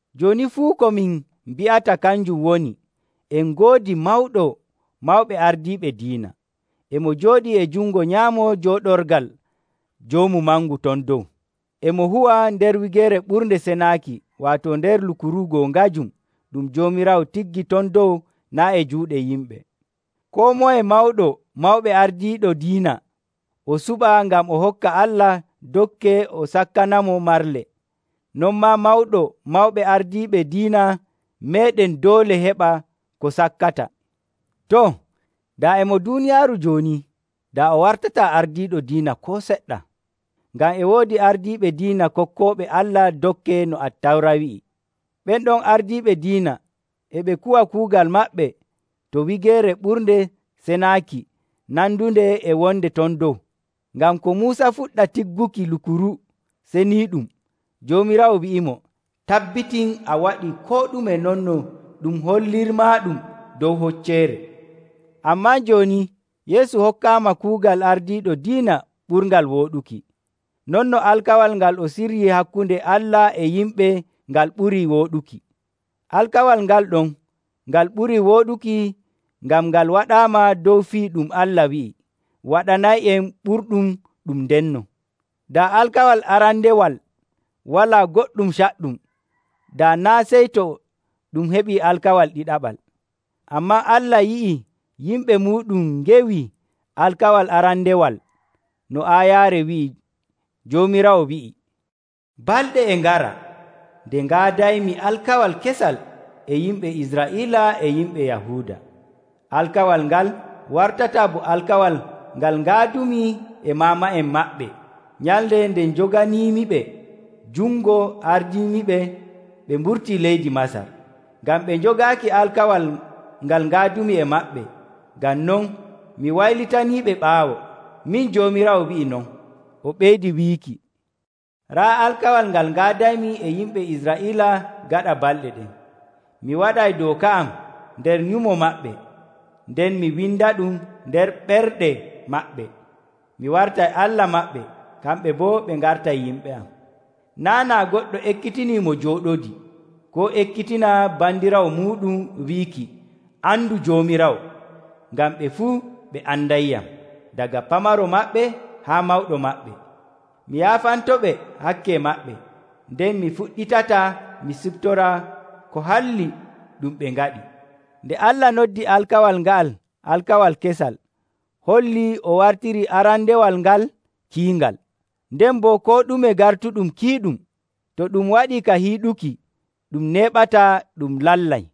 Jooni fuu ko min mbi'ata kanjum woni, en ngoodi Mawɗo Mawɓe Ardiiɓe Diina. E mo jooɗii e jungo nyaamo jooɗorgal Joomu Mangu ton dow. E mo huwa nder Wigeere Ɓurnde Senaaki, waato nder lukuru goongajum ɗum Joomiraawo tiggi ton dow, naa' e juuɗe yimɓe. Koo moye mawɗo mawɓe ardiiɗo diina o suɓa ngam o hokka Allah dokke o sakkanamo marle. Non maa Mawɗo Mawɓe Ardiiɓe Diina meeɗen doole heɓa ko sakkata. Too, daa e mo duuniyaaru jooni, daa o wartataa ardiiɗo diina koo seɗɗa, ngam e woodi ardiiɓe diina kokkooɓe Allah dokke no Attawra wi'i. Ɓen ɗon ardiiɓe diina e ɓe kuwa kuugal maɓɓe to Wigeere Ɓurnde Senaaki nandunde e wonde ton dow. Ngam ko Muusa fuɗɗa tigguki Lukuru Seniiɗum. Joomiraawo wi'imo, “Tabbitin a waɗii koo ɗume non no ɗum hollirmaaɗum dow hocceere.” Ammaa jooni Yeesu hokkaama kuugal ardiiɗo diina ɓurngal wooɗuki, non no alkawal ngal o siryii hakkunde Allah e yimɓe ngal ɓurii wooɗuki. Alkawal ngal ɗon ngal ɓurii wooɗuki ngam ngal waɗaama dow fii ɗum Allah wi'i waɗanay'en ɓurɗum ɗum ndenno. Daa alkawal arandewal walaa goɗɗum caɗɗum, daa naa' sey to ɗum heɓii alkawal ɗiɗaɓal. Ammaa Allah yi'ii yimɓe muuɗum ngewii alkawal arandewal no aayaare wi'i, Joomiraawo wi'ii, “Balɗe e ngara ɗe ngaadaymi alkawal kesal e yimɓe Israa'iila e yimɓe Yahuuda. Alkawal ngal wartataa bo alkawal ngal ngaadumi e maama'en maɓɓe nyalnde nde njoganiimiɓe jungo ardiimiɓe ɓe mburtii leydi Masar. Ngam ɓe njogaaki alkawal ngal ngaadumi e maɓɓe, ngam non mi waylitaniiɓe ɓaawo. Min Joomiraawo wi'i non.” O ɓeydi wiiki, “Raa alkawal ngal ngaadaymi e yimɓe Israa'iila gaɗa balɗe ɗen. Mi waɗay dooka am nder nyumo maɓɓe, nden mi windaɗum nder ɓerɗe maɓɓe. Mi wartay Allah maɓɓe, kamɓe boo ɓe ngartay yimɓe am. Naa' naa goɗɗo ekkitinii mo jooɗodii, koo ekkitina bandiraawo muuɗum wiiki, ‘Andu Joomiraawo,’ ngam ɓe fuu ɓe andayyam, daga pamaro maɓɓe haa mawɗo maɓɓe. Mi yaafantoɓe hakke maɓɓe, nden mi fuɗɗitataa mi siftora ko halli ɗum ɓe ngaɗi.” Nde Allah noddi alkawal nga'al alkawal kesal hollii o wartirii arandewal ngal kiingal. Nden boo koo ɗume gartuɗum kiiɗum, to ɗum waɗii ka hiiɗuki, ɗum neeɓataa ɗum lallay.